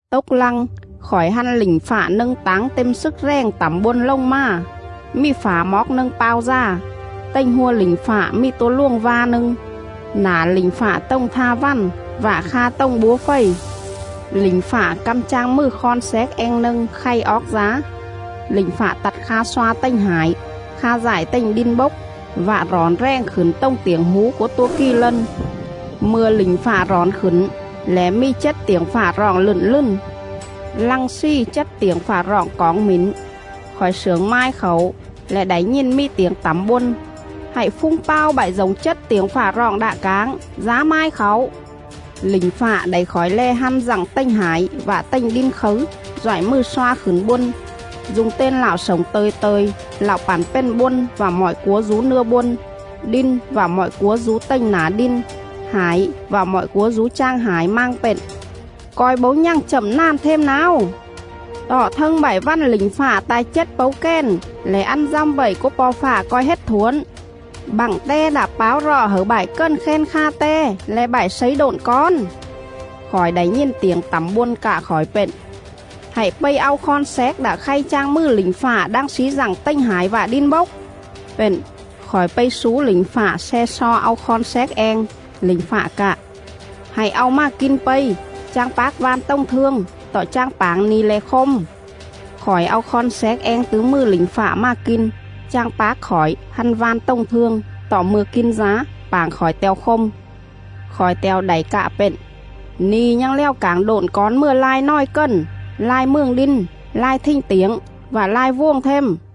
Tốc lăng, khỏi hăn lỉnh fạ nâng táng têm slức rèng tẳm bôn lồng mà, mì phả moóc nâng pao dà. Tềnh hua lỉnh fạ mì tua luồng va nâng; nả lỉnh fạ tồng tha vằn vạ kha tồng búa fầy. Lỉnh fạ căm chang mừ khon xéc eng nâng khay oóc dá. Lỉnh fạ tặt kha sloa tềnh hải, kha dại tềnh đin bốc vạ rỏn rèng khửn tồng tiểng hú cúa tua kì lân. Mư̱a lỉnh fạ rỏn khửn lẻ mì chết tiểng fạ roọng lựn lừn. Lăng slì chết tiểng fạ roọng coỏng mỉn, khỏi slưởng mai khảu lẻ đảy nhìn mì tiểng tẳm bôn: “Hạy phung pao bại dổng chết tiểng fạ roọng đạ cảng, dá mai khảu!” Lỉnh fạ đảy khỏi lè hăn dặng tềnh hải vạ tềnh đin khấư doại mừ sloa khửn bôn,. du̱ng ten Lạo slổng tơ̱i tơ̱i, Lạo pẳn pền bôn vạ mọi cúa dú nưa bôn, đin vạ mọi cúa dú tềnh nả đin, hải vạ mọi cúa dú chang hải, mang pện: “Co̱i bấu nhằng chậm nàn them náo! Tọ thâng bại vằn lỉnh fạ ta̱i chết pấu kèn lẻ ăn dăm vậy cúa Po̱ Fạ co̱i hết thuổn, bặng Te đạ páo rọ hẩư bại cần khen kha Te le̱ bại slấy độn cón.” Khỏi đảy nhìn tiểng tẳm bôn cạ khỏi pện: “Hạy pây au khon xéc đạ khay chang mừ lỉnh fạ đang slí dặng tềnh hải vạ đin bốc.”. Pện, khỏi pây slú lỉnh fạ sle xo au khon xéc eng. Lỉnh fạ cạ: “Hạy au mà kin pây! Chang pác van tồng thương, tọ chang pảng ni̱ lẻ khôm.” Khỏi au khon xéc eng tứ mừ lỉnh fạ mà kin. Chang pác khỏi hăn van tồng thương; tọ mư̱a kin dá, pảng khỏi te̱o khôm. Khỏi te̱o đảy cạ pện: “Ni̱ nhằng lèo cảng độn cón mừa lai nòi cần, lai mường đin, lai thình tiểng, vạ lai vuồng them.”